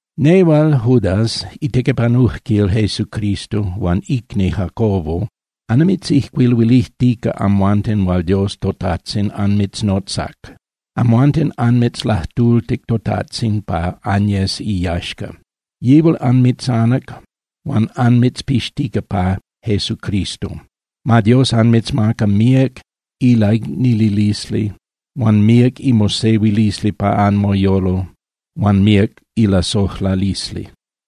Nehual Judas itequipanujquil Jesucristo huan icni Jacobo, annimitzijcuiluilijtica amhuanten hual Dios toTajtzin anmitznotzac. Amhuanten anmitzlajtultic toTajtzin pa anyes iyaxca. Yihual anmitzanac huan anmitzpixtica pa Jesucristo. Ma Dios anmitzmaca míac ilaicnililisli huan míac imosehuilisli pa anmoyolo huan míac ilasojlalisli.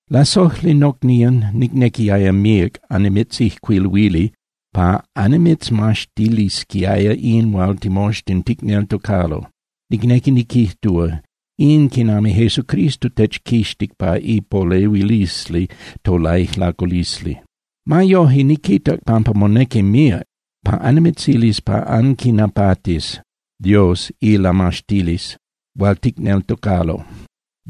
Lasojli nocnían, nicnequiaya míac annimitzijcuiluili pa annimitzmaxtilisquiaya in hual timoxtin ticneltocalo, nicnequi niquijtúa, in quinami Jesucristo techquixtic pa ipolehuilisli tolaijlaculisli. Ma yoje, niquitac pampa monequi míac pa annimitzilis pa anquinapatis Dios ilamaxtilisli hual ticneltocalo.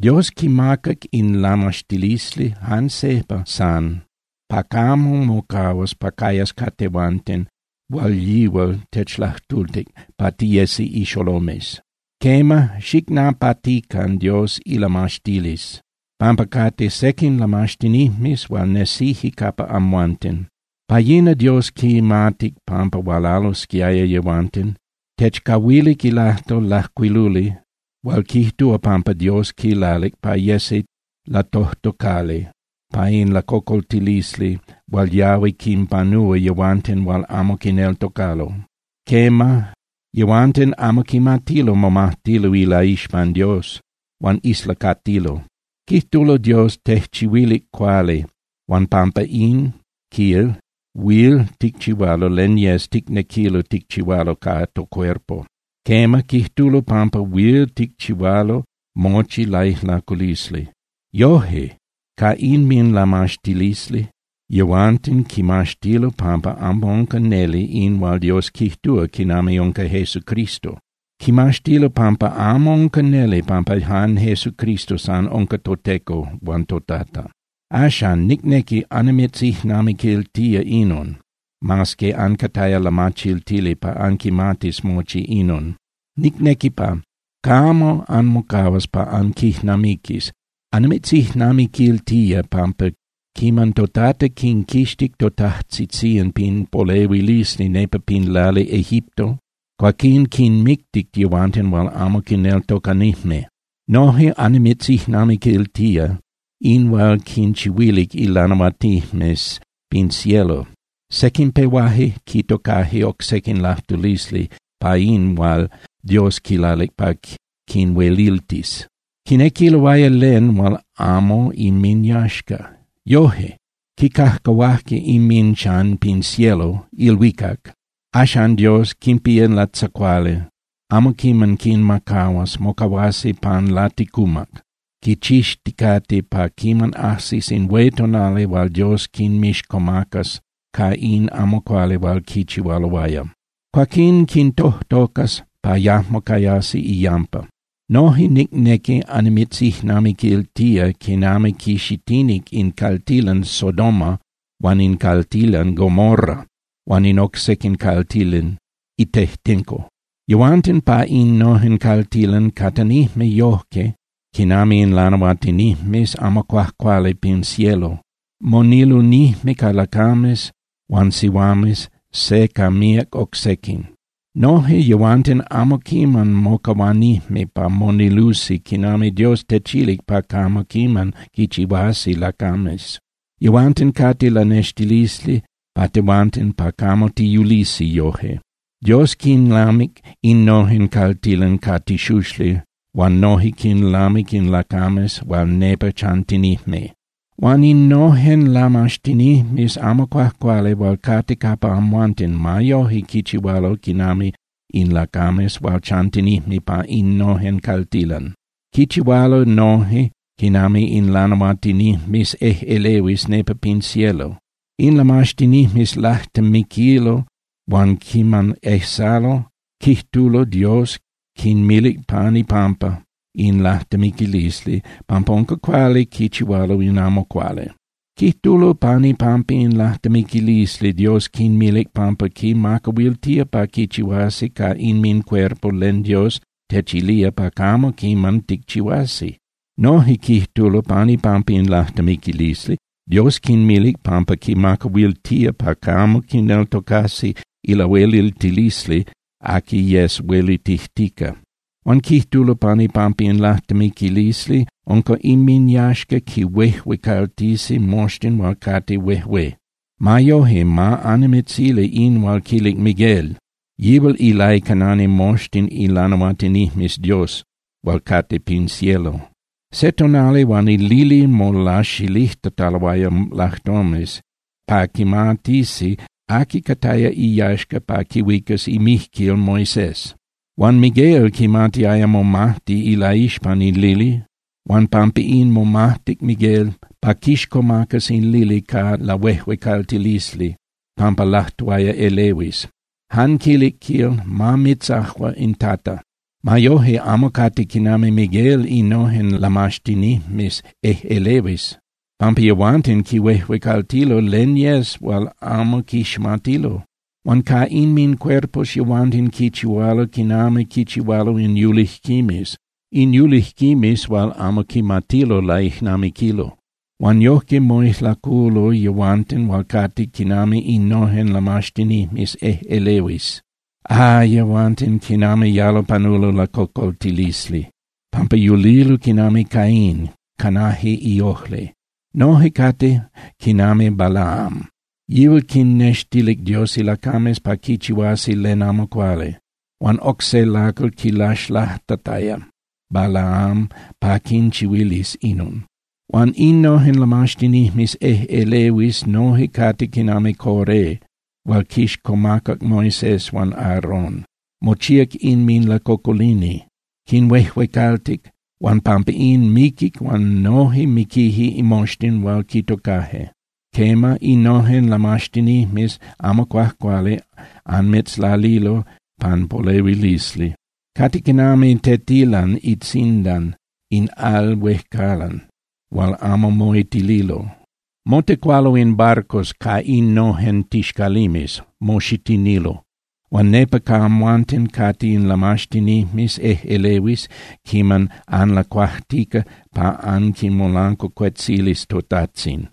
Dios quimacac in lamaxtilisli jan sejpa san pa camo mocahuas pa cayas ca tehuanten hual yihual techlajtultic pa tiyesi ixolomes. Quema, xicnapatican Dios ilamaxtilisli, pampa cate sequin lamaxtinijmes hual nesije capa amhuanten. Pa yina Dios quimatic pampa hualalosquiaya yehuanten. Techcahuilic ilajtol lajcuiluli hual quijtúa pampa Dios quilalic pa yesi latojtocali pa in lacocoltilisli hual yahui quinpanúa yehuanten hual amo quineltocalo. Quema, yehuanten amo quimatilo momajtilo ilaixpan Dios, huan islacatilo. Quijtulo Dios tejchihuilic cuali huan pampa in, quil, huil ticchihualo len yes ticnequilo ticchihualo ca tocuerpo. Quema, quijtulo pampa huil ticchihualo mochi laijlaculisli. Yoje, ca inminlamaxtilisli, yehuanten quimaxtilo pampa amo unca neli in hual Dios quijtúa quinami unca Jesucristo. Quimaxtilo pampa amo unca neli pampa jan Jesucristo san unca toTeco huan toTata. Axan, nicnequi annimitzijnamiquiltía inon, mas que ancataya lamachiltili pa anquimatis mochi inon. Nicnequi pa camo anmocahuas pa anquijnamiquis. Annimitzijnamiquiltía pampa quiman toTata quinquixtic totajtzitzían pin polehuilisli nepa pin lali Egipto, cuaquín quinmictic yehuanten hual amo quineltocanijme. Noje annimitzijnamiquiltía in hual quinchihuilic ilanahuatinijmes pin cielo. Sequin pehuaje quitocaje oc se lajtulisli pa in hual Dios quilalic pa quinhueliltis. Quinequiloaya len hual amo inminyaxca. Yoje, quicajcahuaje inminchan pin cielo (ilhuicac). Axan Dios quinpía latzacuali, amo quiman quinmacahuas, mocahuasi pan laticumac, quichixticate pa quiman ajsis in hué tonali hual Dios quinmixcomacas ca in amo cuali hual quichihualoaya. Cuaquín quintojtocas pa yajmo cayasi iyampa. Noje nicnequi annimitzijnamiquiltía quinami quixitinic in caltilan Sodoma huan in caltilan Gomorra huan in oc sequin caltilan itejtenco. Yehuanten pa innojen caltilan catanijme yojque quinami in lanahuatinijmes amo cuajcuali pin cielo, monilunijme ca lacames huan sihuames, se ca míac oc sequin. Noje yehuanten amo quiman mocahuanijme pa monilusi quinami Dios techilic pa camo quiman quichihuasi lacames. Yehuanten cate lanextilisli pa tehuanten, pa camo tiyulisi yoje. Dios quinlamic innojen caltilan ca tixuxli huan noje quinlamic in lacames hual nepa chantinijme. Huan innojen lamaxtinijmes amo cuajcuali hual cate capa amhuanten ma yoje quichihualo quinami in lacames hual chantinijme pa innojen caltilan. Quichihualo noje quinami in lanahuatinijmes ejꞌelehuis nepa pin cielo. In lamaxtinijmes lajtemiquilo huan quiman ejsalo, quijtulo Dios quinmilic pan ipampa in lajtemiquilisli pampa unca cuali quichihualo in amo cuali. Quijtulo pan ipampa in lajtemiquilisli Dios quinmilic pampa quinmacahuiltía pa quichihuasi ca inmincuerpo len Dios techilía pa camo quiman ticchihuasi. Noje quijtulo pan ipampa in lajtemiquilisli Dios quinmilic pampa quinmacahuiltía pa camo quineltocasi ilahueliltilisli aqui yes huelitijtica. Huan quijtulo pan ipampa in lajtemiquilisli unca inminyaxca quinhuejuecaltisi moxtin hual cate huejué. Ma yoje, ma annimitzili in hual quilic Miguel. Yihual ilaicanani moxtin ilanahuatinijmes Dios hual cate pin cielo. Se tonali huan in lili molaxilijtataloaya lajtomes pa quimatisi aqui cataya iyaxca pa quihuicas imijquil Moisés. Huan Miguel quimatiaya momajti ilaixpan in lili huan pampa in momajtic Miguel pa quixcomacas in lili ca lahuejuecaltilisli pampa lajtuaya elehuis. Jan quilic, quil: “Ma mitzajua in Tata.” Ma yoje, amo cate quinami Miguel innojen lamaxtinijmes ejꞌelehuis, pampa yehuanten quihuejuecaltilo len yes hual amo quiximatilo. Huan ca inmincuerpos yehuanten quichihualo quinami quichihualo in yulijquimes, in yulijquimes hual amo quimatilo laijnamiquilo. Huan yojque moijlaculo yehuanten hual cate quinami innojen lamaxtinijmes ejꞌelehuis. ¡Ah, yehuanten, quinami yalo panulo lacocoltilisli! pampa yulilo quinami Caín, canaje iojli. Noje cate quinami Balaam. Yihual quinnextilic Dios ilacames pa quichihuasi len amo cuali, huan oc se lacal quilaxlajtataya Balaam pa quinchihuilis inon. Huan innojen lamaxtinijmes ejꞌelehuis noje cate quinami Coré hual quixcomacac Moisés huan Aarón, mochíac inminlacocolini. Quinhuejuecaltic, huan pampa in, miquic huan noje miquije moxtin hual quitocaje. Quema, innojen lamaxtinijmes amo cuajcuali anmitzlalilo pan polehuilisli. Cate quinami tetilan itzindan in al huejcalan hual amo moitililo. Motecualo in barcos ca innojen tixcalimes, moxitinilo. Huan nepa ca amhuanten cate in lamaxtinijmes ejꞌelehuis quiman anlacuajtica pa anquimolancuacuetzilis toTajtzin.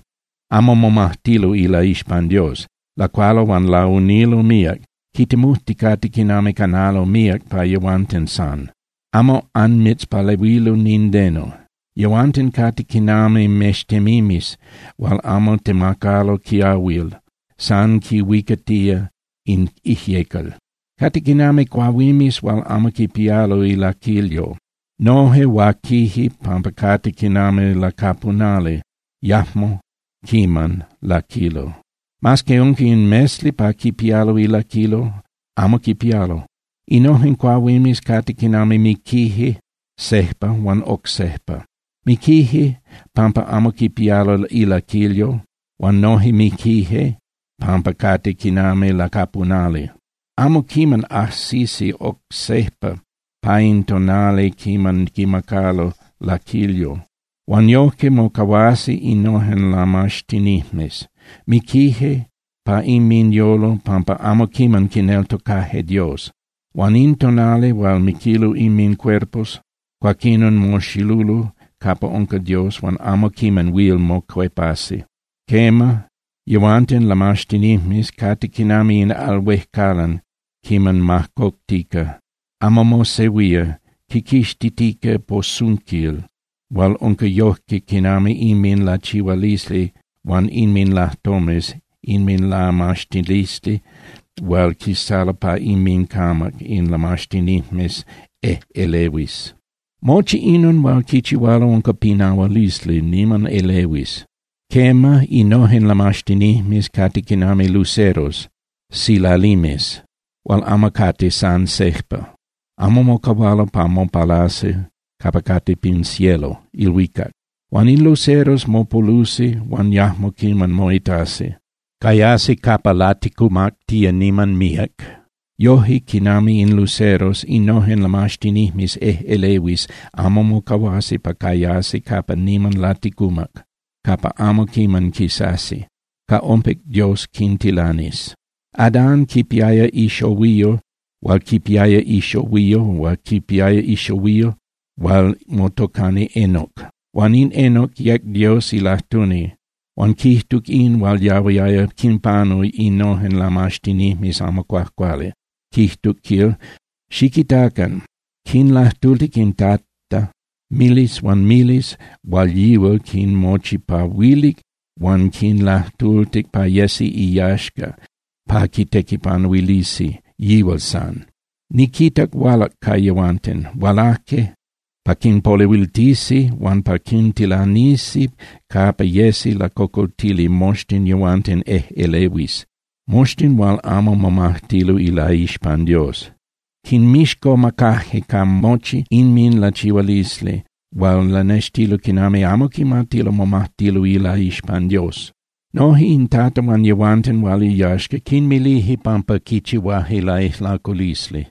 Amo momajtilo ilaixpan Dios. Lacualo huan launilo míac, quitemujticate quinami canalo míac pa yehuanten san. Amo anmitzpalehuilo nindeno. Yehuanten cate quinami mextemimes hual amo temacalo quiahuil, san quinhuicatía in ijyecal. Cate quinami cuahuimes hual amo quipialo ilaquilyo. Noje huaquije pampa cate quinami lacapunali, yajmo quiman laquilo. Mas que unca in mesli pa quipialo ilaquilyo, amo quipialo. Innojen cuahuimes cate quinami miquije sejpa huan oc sejpa. Miquije pampa amo quipialo ilaquilyo huan noje miquije pampa cate quinami lacapunali. Amo quiman ajsisi oc sejpa pa in tonali quiman quimacalo laquilyo. Huan yojque mocahuasi innojen lamaxtinijmes. Miquije pa inminyolo pampa amo quiman quineltocaje Dios, huan in tonali hual miquilo inmincuerpos, cuaquinon moxilulo capa unca Dios huan amo quiman huil mocuepasi. Quema, yehuanten lamaxtinijmes cate quinami in al huejcalan quiman majcoctica. Amo mosehuía, quiquixtitica posunquil hual unca yojque quinami inminlachihualisli huan inminlajtomes inminlamaxtilisli hual quisalo pa inmincamac in lamaxtinijmes ejꞌelehuis. Mochi inon hual quichihualo unca pinahualisli niman elehuis. Quema, innojen lamaxtinijmes cate quinami luceros (silalimes) hual amo cate san sejpa, amo mocahualo pa mopalasi capa cate pin cielo (ilhuicac). Huan in luceros mopolusi huan yajmo quiman moitasi. Cayasi capa laticumactía niman míac. Yoje quinami in luceros, innojen lamaxtinijmes ejꞌelehuis amo mocahuasi pa cayasi capa niman laticumac, capa amo quiman quisasi. Ca ompic Dios quintilanis. Adán quipiaya ixohuiyo hual quipiaya ixohuiyo hual quipiaya ixohuiyo hual motocani Enoc. Huan in Enoc yec Dios ilajtuni huan quijtuc in hual yahuiaya quinpanu innojen lamaxtinijmes amo cuajcuali, quijtuc, quil: “Xiquitacan. Quinlajtultic in Tata miles huan miles hual yihual quinmochipahuilic huan quinlajtultic pa yesi iyaxca pa quitequipanuilisi yihual san. Niquitac hualac ca yehuanten. Hualaje pa quinpolehuiltisi huan pa quintilanisi capa yesi lacocoltili moxtin yehuanten ejꞌelehuis, moxtin hual amo momajtilo ilaixpan Dios. Quinmixcomacaje ca mochi inminlachihualisli hual lanextililo quinami amo quimatilo momajtilo ilaixpan Dios. Noje in Tata huan yehuanten hual iyaxca quinmilije pampa quichihuaje laijlaculisli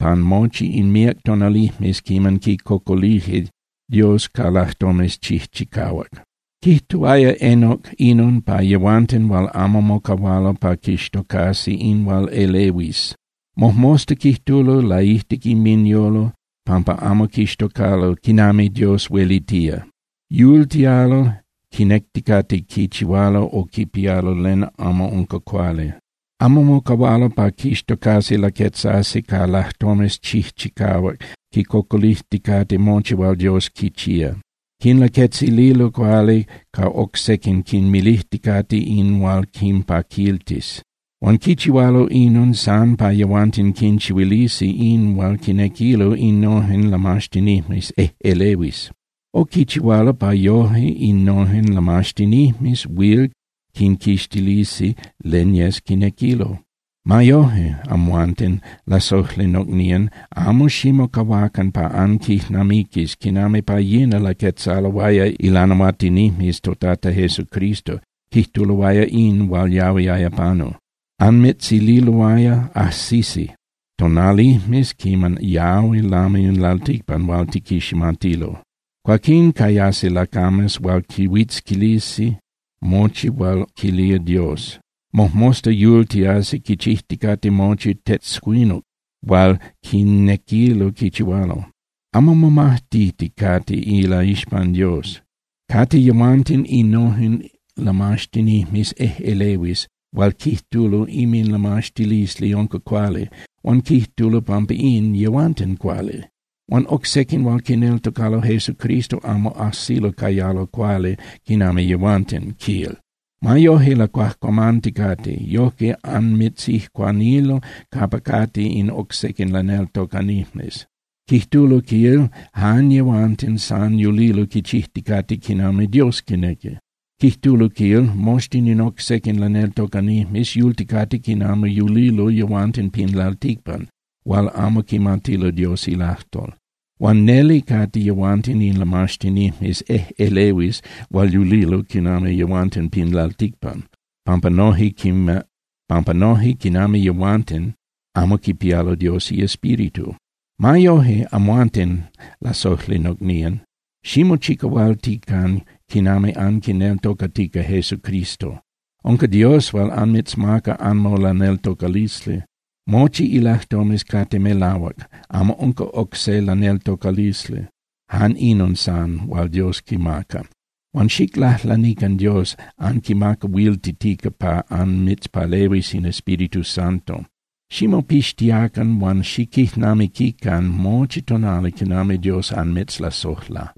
pan mochi in míac tonalijmes quiman quicocolije Dios ca lajtomes chijchicahuac.” Quijtuaya Enoc inon pa yehuanten hual amo mocahualo pa quixtocasi in hual elehuis. Mojmosta quijtulo laijtic inminyolo pampa amo quixtocalo quinami Dios huelitía. Yultialo quinecticate quichihualo o quipialo len amo unca cuali. Amo mocahualo pa quixtocasi laquetzasi ca lajtomes chijchicahuac quicocolijticate mochi hual Dios quichía. Quinlaquetzililo cuali ca oc sequin quinmilijticate in hual quinpaquiltis. Huan quichihualo inon san pa yehuanten quinchihuilisi in hual quinequilo innojen lamaxtinijmes ejꞌelehuis. O quichihualo pa yoje innojen lamaxtinijmes huil quinquixtilisi len yes quinequilo. Ma yoje, amhuanten, lasojli nocnían, amo ximocahuacan pa anquijnamiquis quinami pa yina laquetzaloaya ilanahuatinijmes toTata Jesucristo, quijtuloaya in hual yahuiaya panu. Anmitzililoaya: Ajsisi tonalijmes quiman yahui lami in lalticpan hual tiquiximatilo. Cuaquín cayasi lacames hual quihuitzquilisi mochi hual quilía Dios. Mojmosta yultiasi quichijticate mochi tetzcuinuc hual quinequilo quichihualo, amo momajtiticate ilaixpan Dios. Cate yehuanten innojen lamaxtinijmes ejꞌelehuis hual quijtulo inminlamaxtilisli unca cuali, huan quijtulo pampa in, yehuanten cuali. Huan oc sequin hual quineltocalo Jesucristo amo ajsilo cayalo cuali quinami yehuanten, quil. Ma yoje, lacuajcuamanticate, yojque anmitzijcuanilo capa cate in oc sequin laneltocanijmes. Quijtulo, quil, jan yehuanten san yulilo quichijticate quinami Dios quinequi. Quijtulo, quil, moxtin in oc sequin laneltocanijmes yulticate quinami yulilo yehuanten pin lalticpan hual amo quimatilo Dios ilajtol. Huan neli cate yehuanten in lamaxtinijmes ejꞌelehuis hual yulilo quinami yehuanten pin lalticpan, pampa noje quinami yehuanten, amo quipialo Dios iEspíritu. Ma yoje, amhuanten, lasojli nocnían, ximochicahualtican quinami anquineltocatica Jesucristo. Unca Dios hual anmitzmaca anmolaneltocalisli. Mochi ilajtomes cate melahuac, amo unca oc se laneltocalisli, jan inon san hual Dios quimaca. Huan xiclajlanican Dios anquimacahuiltitica pa anmitzpalehuis in Espíritu Santo. Ximopixtiacan huan xiquijnamiquican mochi tonali quinami Dios anmitzlasojla.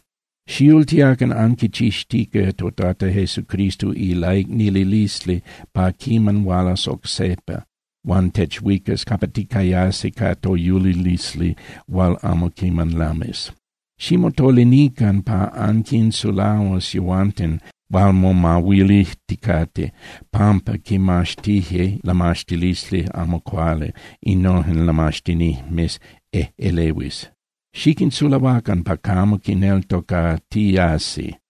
Xiyultiacan anquichixtica toTata Jesucristo ilaicnililisli pa quiman hualas oc sejpa huan techuicas capa ticayasi ca toyulilisli hual amo quiman lamis. Ximotolinican pa anquinsulahuas yehuanten hual momahuilijticate pampa quinmaxtije in lamaxtilisli amo cuali innojen lamaxtinijmes ejꞌelehuis, xiquinsulahuacan pa camo quineltocatiasi.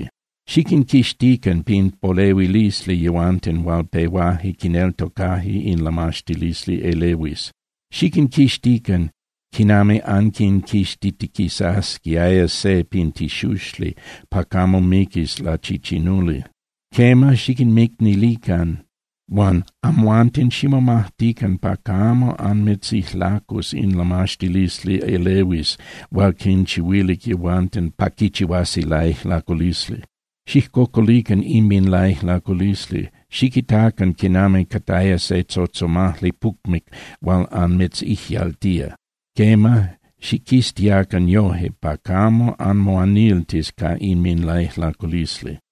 Xiquinquixtican pin polehuilisli yehuanten hual pehuaje quineltocaje in lamaxtilisli elehuis. Xiquinquixtican quinami anquinquixtitiquisasquiaya se pin tixuxli pa camo miquis lachichinuli. Quema, xiquinmicnilican, huan amhuanten ximomajtican pa camo anmitzijlacus in lamaxtilisli elehuis hual quinchihuilic yehuanten pa quichihuasi laijlaculisli. Xijcocolican inminlaijlaculisli, xiquitacan quinami cataya se tzotzomajli pucmic hual anmitzijyaltía. Quema, xiquiztiacan yoje pa camo anmoaniltis ca inminlaijlaculisli.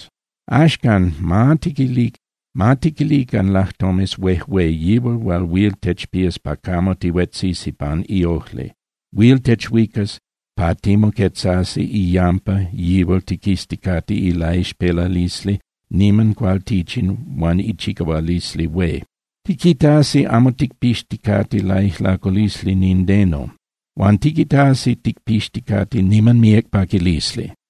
Axcan, ma tiquilican lajtomes huejué yihual hual huil techpías pa camo tihuetzisi pan iojli. Huil techuicas pa timoquetzasi iyampa yihual tiquizticate ilaixpelalisli niman cualtichin huan ichicahualisli hué. Tiquitasi amo ticpixticate laijlaculisli nindeno. Huan tiquitasi ticpixticate niman míac paquilisli.